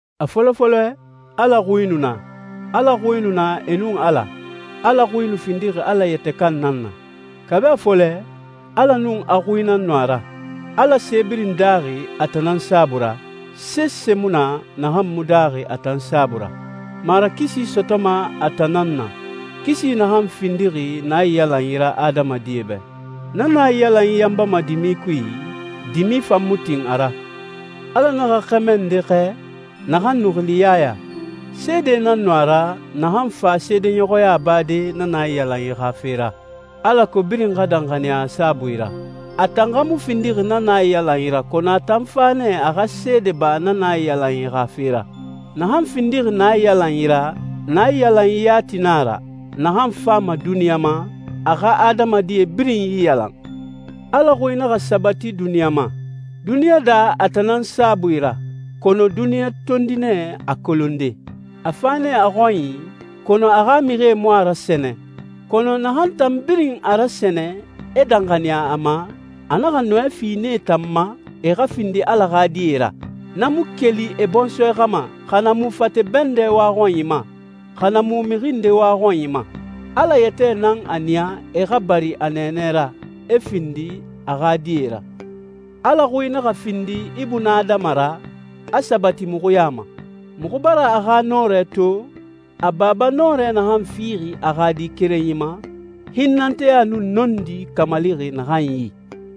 A fɔlɔ fɔlɛ, Ala Xui nu na, Ala Xui nu na e nun Ala, Ala Xui nu findixi Ala yɛtɛ kan nan na. Kabi a fɔlɛ, Ala nun a Xui nan nu a ra. Ala se birin daaxi a tan nan saabui ra, sese mu na naxan mu daaxi a tan saabui ra. Marakisi sɔtɔma a tan nan na, kisi naxan findixi naiyalanyi ra adamadie bɛ. Na naiyalanyi yanbama dimi kui, dimi fan mu tin a ra. Ala naxa xɛmɛ nde xɛɛ, naxan nu xili Yaya. Seede nan nu a ra, naxan fa seedeɲɔxɔya bade na naiyalanyi xa fe ra, alako birin xa danxaniya a saabui ra. A tan xa mu findixi na naiyalanyi ra, kɔnɔ a tan fa nɛ a xa seede ba na naiyalanyi xa fe ra. Naxan findixi naiyalanyi ra, naiyalanyi yati na a ra, naxan fama duniɲa ma, a xa adamadie birin iyalan. Ala Xui naxa sabati duniɲa ma. Duniɲa daa a tan nan saabui ra, kɔnɔ duniɲa tondi nɛ a kolonde. A fa nɛ a xɔnyi, kɔnɔ a xa mixie mu a rasɛnɛ. Kɔnɔ naxan tan birin a rasɛnɛ, e danxaniya a ma, a naxa nɔɛ fi nee tan ma, e xa findi Ala xa die ra. Na mu keli e bɔnsɔɛ xa ma, xa na mu fate bɛndɛ waxɔnyi ma, xa na mu mixi nde waxɔnyi ma. Ala yɛtɛ nan a niya e xa bari a nɛɛnɛ ra, e findi a xa die ra. Ala Xui naxa findi ibunadama ra, a sabati muxu ya ma. Muxu bara a xa nɔrɛ to, a Baba nɔrɛ naxan fixi a xa Di kerenyi ma, hinnɛnteya nun nɔndi kamalixi naxan yi.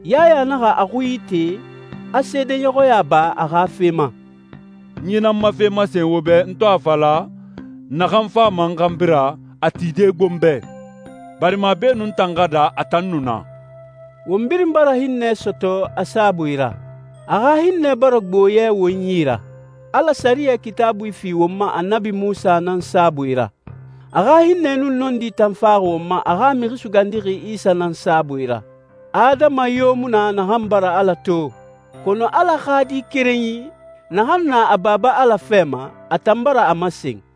Yaya naxa a xui ite, a seedeɲɔxɔya ba a xa fe ma, «N yi nan ma fe masen wo bɛ, n to a fala, ‹Naxan fama n xanbi ra, a tide gbo n bɛ, barima beenun n tan xa daa, a tan nu na.›» Won birin bara hinnɛ sɔtɔ a saabui ra. A xa hinnɛ bara gbo yɛ won yi ra. Ala sɛriyɛ Kitaabui fi won ma Annabi Munsa nan saabui ra. A xa hinnɛ nun nɔndi tan faxi won ma a xa Mixi Sugandixi Isa nan saabui ra. Adama yo mu na naxan bara Ala to, kɔnɔ Ala xa Di kerenyi, naxan na a Baba Ala fɛ ma, a tan bara a masen.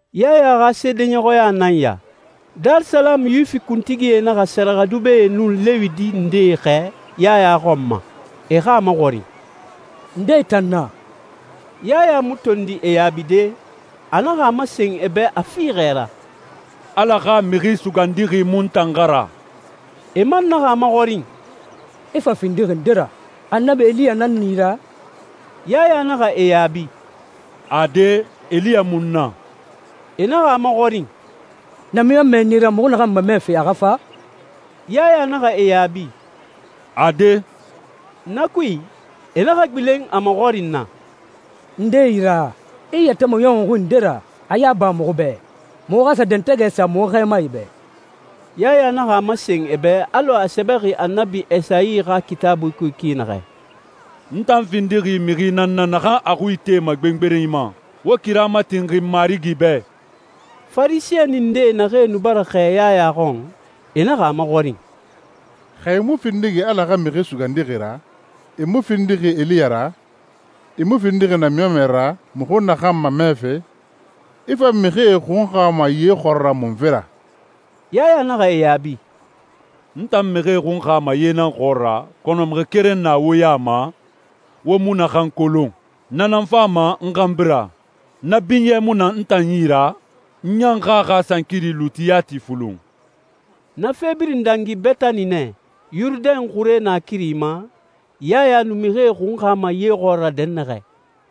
Yaya xa seedeɲɔxɔya nan ya. Darisalamu Yuwifi kuntigie naxa sɛrɛxɛdubɛe nun Lewi di ndee xɛɛ Yaya xɔn ma, e xa a maxɔrin, «Nde i tan na?» Yaya mu tondi e yaabide, a naxa a masen e bɛ a fiixɛ ra, «Ala xa Mixi Sugandixi mu n tan xa ra.» E man naxa a maxɔrin, «I fa findixi nde ra? Annabi Eliya nan na i ra?» Yaya naxa e yaabi, «Ade, Eliya mu n na.» E naxa a maxɔrin, «Namiɲɔnmɛ nan i ra muxu naxan mamɛfe a xa fa?» Yaya naxa e yaabi, «Ade.» Na kui, e naxa gbilen a maxɔrin na, «Nde i ra? I i yɛtɛ maɲɔxunxi nde ra? A yaba muxu bɛ, muxu xa sa dɛntɛgɛ sa muxu xɛɛmae bɛ.» Yaya naxa a masen e bɛ alɔ a sɛbɛxi Annabi Esayi xa Kitaabui kui ki naxɛ, «N tan findixi mixi nan na naxan a xui itema gbengberenyi ma, ‹Wo kira matinxin Marigi bɛ!›» Farisɛni nde naxee nu bara xɛɛ Yaya xɔn, e naxa a maxɔrin, «Xa i mu findixi Ala xa Mixi Sugandixi ra, i mu findixi Eliya ra, i mu findixi namiɲɔnmɛ ra muxu naxan mamɛfe, i fa mixie xunxama ye xɔɔra munfe ra?» Yaya naxa e yaabi, «N tan mixie xunxama ye nan xɔɔra, kɔnɔ mixi keren na wo ya ma, wo mu naxan kolon. Na nan fama n xanbi ra. Na binyɛ mu na n tan yi ra, n ɲan xa a xa sankiri luuti yati fulun.» Na fe birin dangi Betani nɛ, Yurudɛn xure naakiri ma, Yaya nu mixie xunxama ye xɔɔra dɛnnaxɛ.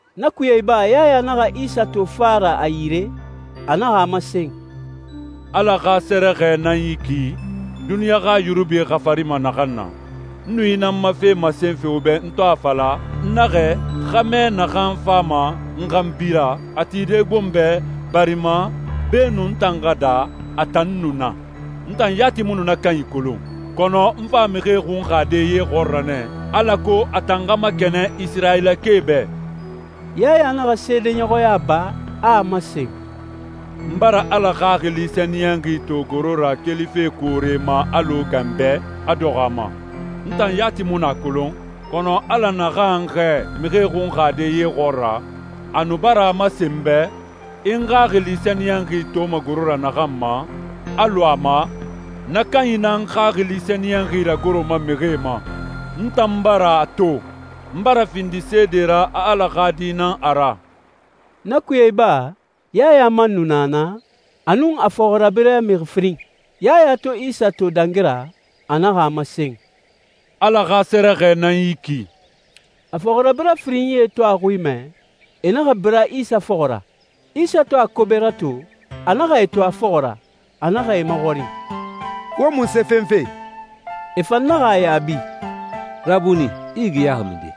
Na kuye iba, Yaya naxa Isa to fa ra a yire, a naxa a masen, «Ala xa sɛrɛxɛ nan yi ki, duniɲa xa yunubi xafarima naxan na. N nu yi nan ma fe masenfe wo bɛ n to a fala, n naxɛ, ‹Xɛmɛ naxan fama n xanbi ra, a tide gbo n bɛ, barima beenun n tan xa daa, a tan nu na.› N tan yati mu nu na kanyi kolon, kɔnɔ n fa mixie xunxade ye xɔɔra nɛ alako a tan xa makɛnɛn Isirayilakae bɛ.» Yaya naxa seedeɲɔxɔya ba, a a masen, «N bara Ala Xaxili Sɛniyɛnxi to goro ra kelife koore ma alɔ ganbɛ, a dɔxɔ a ma. N tan yati mu nu a kolon, kɔnɔ Ala naxan n xɛɛ mixie xunxade ye xɔɔra, a nu bara a masen n bɛ, ‹I n Xaxili Sɛniyɛnxi toma goro ra naxan ma, a lu a ma, na kanyi nan n Xaxili Sɛniyɛnxi ragoroma mixie ma.› N tan bara a to. N bara findi seede ra a Ala xa Di nan a ra.» Na kuye iba, Yaya man nu na naa, a nun a fɔxirabirɛ mixi firin. Yaya to Isa to dangi ra, a naxa a masen, «Ala xa sɛrɛxɛ nan yi ki!» A fɔxirabirɛ firinyie to a xui mɛ, e naxa bira Isa fɔxɔ ra. Isa to a kobe rato, a naxa e to a fɔxɔ ra, a naxa e maxɔrin, «Wo munse fenfe?» E fan naxa a yaabi, «Rabuni, i yigiyaxi minden?»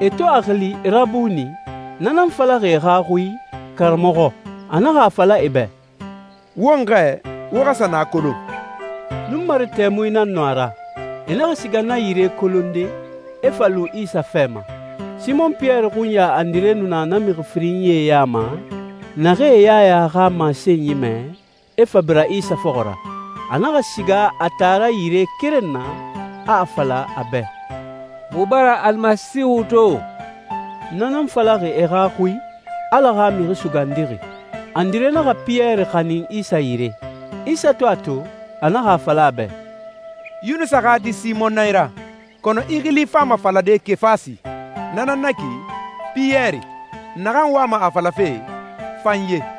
E to a xili «Rabuni», na nan falaxi e xa xui «Karamɔxɔ». A naxa a fala e bɛ, «Won xɛɛ, wo xa sa na kolon.» Nunmare tɛmui nan nu a ra. E naxa siga na yire kolonde, e fa lu Isa fɛ ma. Simɔn Piyɛri xunya Andire nu na na mixi firinyie ya ma, naxee Yaya xa masenyi mɛ, e fa bira Isa fɔxɔ ra. A naxa siga a taara yire keren na, a a fala a bɛ, «Muxu bara Al Masiihu to!» Na nan falaxi e xa xui, «Ala xa Mixi Sugandixi». Andire naxa Piyɛri xanin Isa yire. Isa to a to, a naxa a fala a bɛ, «Yunusa xa di Simɔn nan i ra, kɔnɔ i xili fama falade Kefasi, na nan na ki ‹Piyɛri,› naxan wama a falafe ‹fanye›.»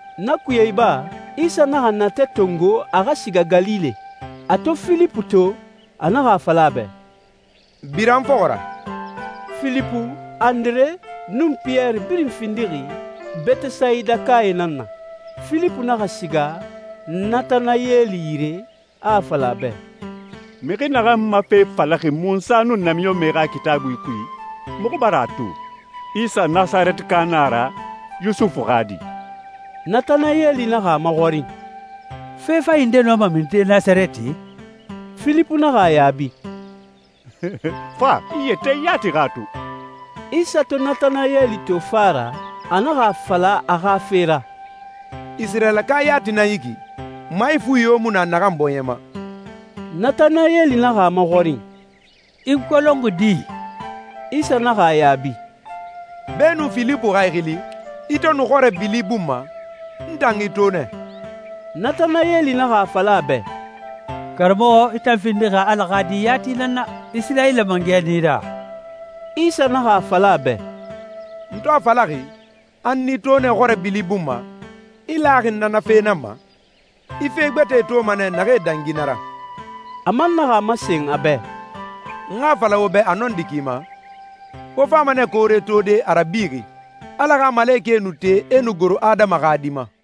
Na kuye iba, Isa naxa natɛ tongo a xa siga Galile. A to Filipu to, a naxa a fala a bɛ, «Bira n fɔxɔ ra.» Filipu, Andire, nun Piyɛri birin findi Betesayidakae nan na. Filipu naxa siga Natanayɛli yire, a a fala a bɛ, «Mixi naxan ma fe falaxi Munsa nun namiɲɔnmɛe xa Kitaabuie kui, muxu bara a to. Isa Nasarɛtika nan a ra, Yusufu xa di!» Natanayɛli naxa a maxɔrin, «Fe fanyi nde nɔma minide Nasarɛti?» Filipu naxa a yaabi, «Fa, i yɛtɛ yati xa a to.» Isa to Natanayɛli to fa ra, a naxa a fala a xa fe ra, «Isirayilaka yati nan yi ki, maifuya yo mu na naxan bɔɲɛ ma!» Natanayɛli naxa a maxɔrin, «I n kolonxi di?» Isa naxa a yaabi, «Beenun Filipu xa i xili, i to nu xɔrɛ bili bun ma, n tan i to nɛ.» Natanayɛli naxa a fala a bɛ, «Karamɔxɔ, i tan findixi Ala xa Di yati nan na! Isirayila Mangɛ nan i ra!» Isa naxa a fala a bɛ, «N to a falaxi, a n i to nɛ xɔrɛ bili bun ma, i laxi n na na fe nan ma? I fe gbɛtɛe toma nɛ naxee dangi na ra.» A man naxa a masen a bɛ, «N xa a fala wo bɛ a nɔndi ki ma, wo fama nɛ koore tode, a rabixi, Ala xa malekɛe nu te e nu goro Adama xa Di ma.»